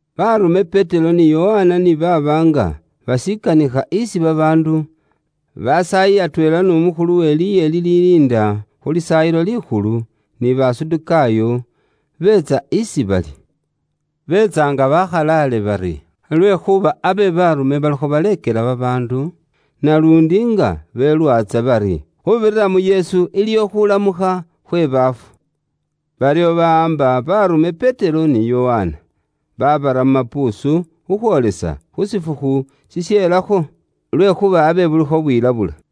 Baarume Petero ni Yokana ni baaba nga bashikanikha isi babaandu, basaayi atweela n'umukhulu we liye liliinda khu Lisaayilo Likhulu, ni Basadukaayo, beetsa isi bali, beetsa nga bakhalaale bari lwekhuuba abe baarume balikho baleekela babaandu, naluundi nga belwaatsa bari khuubirira mu Yesu, iliwo khuulamukha khwe baafu. Baryo bawaamba baarume Petero ni Yokana, baabara mu mapuusu khukhwoolesa khu shifukhu shisheelakho. Lwekhuuba abe bulikho bwilabula.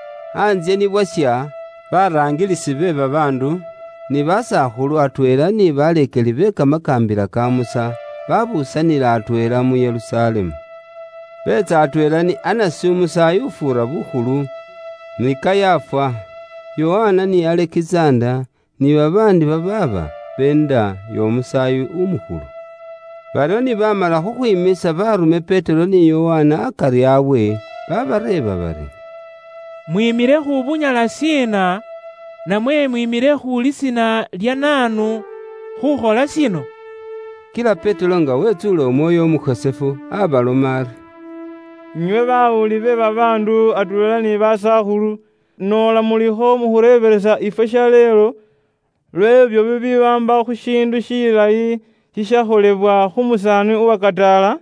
Antsye ni bwasha, baraangilisi be babaandu, ni basakhulu, atweela ni baleekeli be kamakaambila ka Musa, babuusanila atweela mu Yerusalemu. Beetsa atweela ni Anasi umusaayi ufuura bukhulu, ni Kayafa, Yokana ni Alekizanda, ni babaandi babaaba beenda y'omusaayi umukhulu. Baryo ni baamala khukhwiiimisa baarume Petero ni Yokana akari abwe, babareeba bari, “Mwiimile khu bunyala shiina, namwe mwiimile khu lisiina lya naanu khukhola shino?” Kila Petero nga wetsuule Umwoyo Umukhosefu abaloma ari, “Inywe bawuli be babaandu atweela ni basakhulu, noola mulikho mukhureebelesa ifwe shaleelo lw'ebyo bibiwaamba khu shiindu shilayi shishakholebwa khu musaani uwakataala,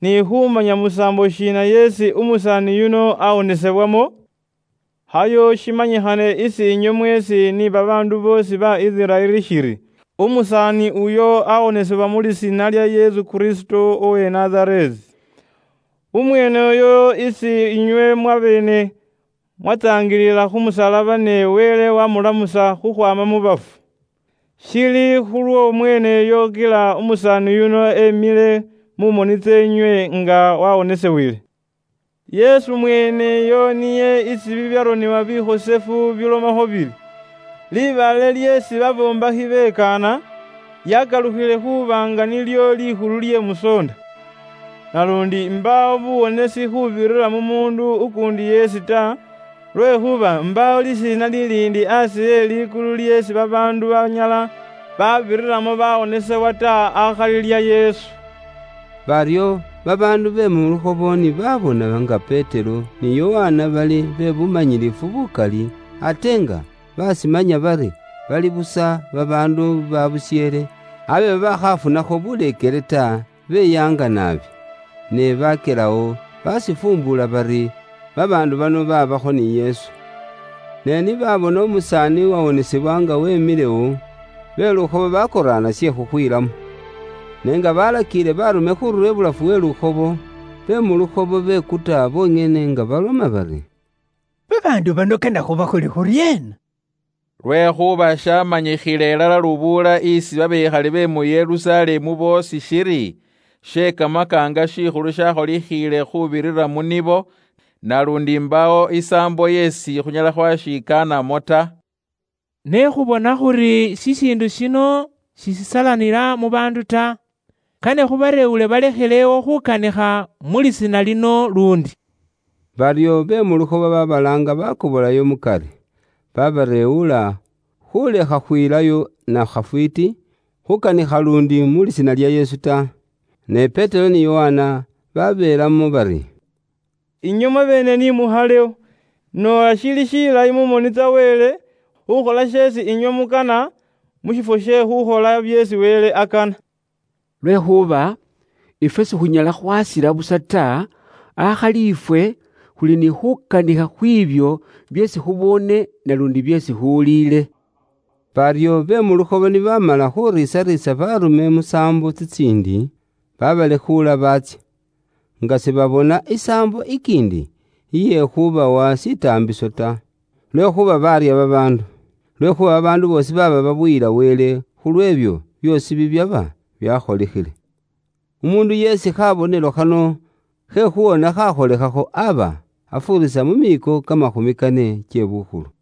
ni khumanya musaambo shiina yeesi umusaani yuno awonesebwamo, khayo shimanyikhane isi inywe mweesi ni babaandu boosi ba Isiraeli shiri, umusaani uyo awonesebwa mu lisiina lya Yesu Kristo uwe Nazareesi. Umweene uyo isi inywe mwabeene mwatsaangilila khu musalaba ne Wele wamulamusa khukhwaama mu bafu. Shili khulwo mweeneyo kila umusaani yuno emile mu moni tseenywe nga wawonisibwile. Yesu mweeneyo niye isi bibyaronebwa bikhosefu bilomakho bili, ‘Libaale lyeesi babombekhi bekaana, lyakalukhile khuuba nga nilyo likhulu lye musoonda.’ Naluundi mbaawo buwonesi khuubirira mu muundu ukuundi yeesi ta, lwekhuuba mbaawo lisiina liliindi aasi e likulu lyeesi babaandu banyala babiriramo bawonesebwa ta akhali lya Yesu.” Baryo babaandu be mu lukhobo ni baabona nga Petero ni Yokana bali bebumanyilifu bukali, ate nga bashimanya bari bali busa babaandu ba busheele, abe babaakhafunakho buleekele ta, beyaanga naabi. Ne bakyelawo bashifuumbula bari, babaandu bano babaakho ni Yesu. Ne ni babona umusaani uwawonesebwa nga wemilewo, be lukhobo bakoraana she khukhwiilamo. Ne nga balakiile baarume khurura ibulafu we lukhobo, be mu lukhobo bekuta bonyene nga baloma bari, “Babaandu bano kane khubakhole khuryeena? Lwekhuuba shamanyikhiile ilala lubuula isi babekhali be mu Yerusalemu boosi shiri, she kamakaanga shikhulu shakholikhile khuubirira mu nibo, naluundi mbaawo isaambo yeesi khunyala khwashikanamo ta. Ne khubona khuri shishiindu shino sishisalanila mu baandu ta, kane khubareewule balekhelewo khukanikha mu lisiina lino luundi.” Baryo be mu lukhobo babalaanga bakobolayo mukari, babareewula khulekha khwilayo na khafwiiti khukanikha luundi mu Lisiina lya Yesu ta. Ne Petero ni Yokana baabeelamo bari, “Inywe mwabeene ni mukhalewo noola shili shilayi mu moni tsa Wele khukhola sheesi inywe mukana mu shifwo she khukhola byeesi Wele akana. Lwekhuuba ifwe sikhunyala khwasila busa ta, akhali ifwe khuli ni khukanikha khwiibyo byeesi khuboone naluundi byeesi khuwuliile.” Baryo be mu lukhobo ni baamala khuriisariisa baarume musaambo tsitsiindi, babalekhuula baatsya, nga sibabona isaambo ikiindi iye khubawa shitaambiso ta, lwekhuuba baarya babaandu. Lwekhuuba babaandu boosi baaba babuyila Wele khu lw'ebyo byoosi bibyaba byakholikhile. Umuundu yeesi khabonelo khano khe khuwona khakholekhakho aba afuurisa mu miiko kamakhumi kane kye bukhulu.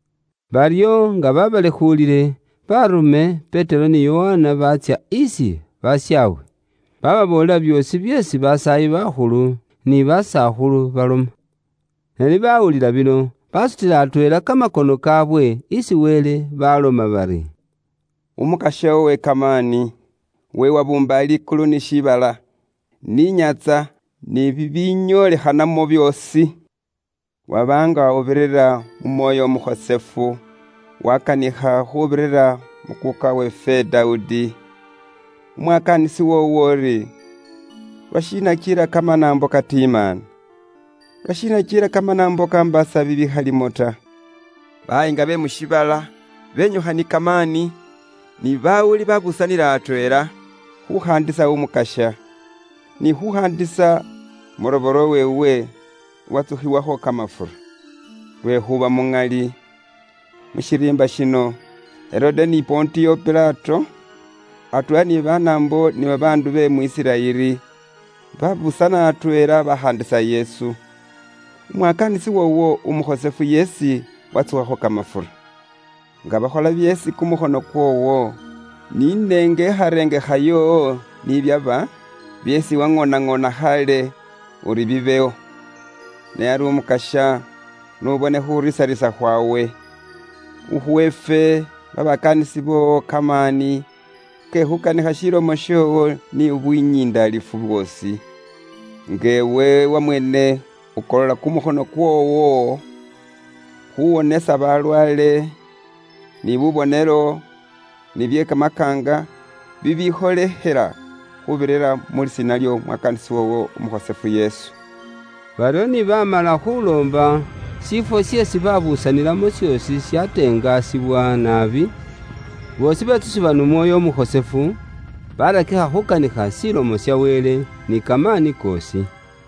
Baryo nga babalekhuulile, baarume Petero ni Yokana baatsya isi bashaabwe, bababoolela byoosi byeesi basaayi bakhulu ni basakhulu baloma. Ne ni bawulila bino, basutila atweela kamakono kaawe isi Wele, baloma bari, “Umukasya uwe kamaani, iwe uwabuumba likulu ni shiibala, ni inyaantsa ni bibinyoolikhanamo byoosi, waba nga ubirira mu Mwoyo Umukhosefu wakanikha khuubirira mu kuuka weefwe Dawudi, umwakaanisi woowo uri, ‘Lwashiina kila kamanaambo katimaana? Lwashiina kila kamanaambo kambaasa bibikhalimo ta? Bayiinga be mu shiibala benyukha ni kamaani, ni bawuli babuusanila atweela, khukhaandisa Umukasya, ni khukhaandisa umurobole weewe Uwatsukhiwakho kamafura.’ Lwekhuuba muŋali, mu shiriimba shino, Herode ni Pontiyo Pilato, atweela ni Banaambo ni babaandu be mu Isiraeli, babuusana atweela bakhaandisa Yesu, umwakaanisi woowo umukhosefu yeesi watsukhakho kamafura, nga bakhola byeesi kumukhono kwoowo ni nengarengekha yoowo ni byaba, byeesi waŋoonaŋoona khaale uri bibewo. Ne ari Umukasya, n'ubone khuriisariisa khwawe, ukhuwe ifwe babakaanisi boowo kamaani ke khukanikha shilomo shoowo ni bunyindalifu bwoosi, nga iwe wamweene ukolola kumukhono kwoowo khuwonesa balwaale, ni bubonelo ni bye kamakaanga bibikholekhela khuubirira mu Lisiina ly'omwakaanisi woowo Umukhosefu Yesu.” Baryo ni baamala khuuloomba, shiifwo sheesi babuusanilamo shoosi shatengasibwa naabi, boosi betsusibwa n'Umwoyo Umukhosefu, baarakikha khuukanikha Ilomo ya Wele ni kamaani koosi.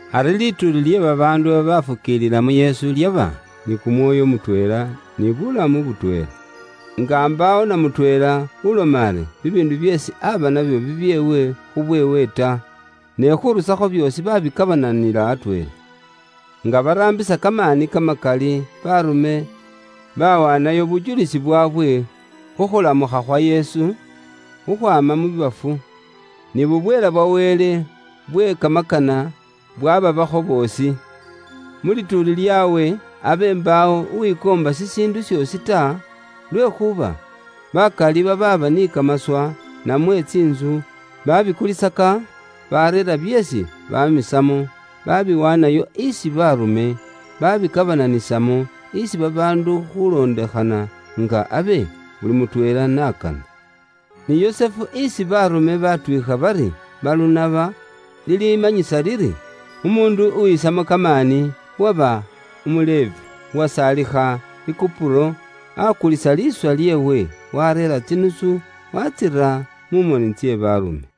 Ari lituuli lye babaandu babaafukiilila mu Yesu lyaba ni kumwoyo mutweela ni bulamu butweela. Nga mbaawo na mutweela uloma ari bibiindu byeesi aba nabyo bibyeewe khubweewe ta, ne khurusakho byoosi babikabananila atweela. Nga baraambisa kamaani kamakali, baarume bawaanayo bujulisi bwaabwe khu khulamukha khwa Yesu khukhwaama mu bafu, ni bubweela bwa Wele bwe kamakana bwababaakho boosi. Mu lituuli lyaabwe abe mbaawo uwikoomba shishiindu shoosi ta, lwekhuuba bakali babaaba ni kamaswa, namwe tsiintsu, babikulisaka, bareera byeesi bamisamo, babiwaanayo isi baarume, babikabananisamo isi babaandu khulondekhana nga abe buli mutweela n'akana. Ni Yusufu isi baarume baatwiikha bari, Balunaba (lilimanyisa liri, umuundu uwisamo kamaani), uwaba umu Levi, uwasaalikha i Kupuro, aakulisa liiswa lyeewe, waareera tsinusu, waatsira mu moni tse baarume.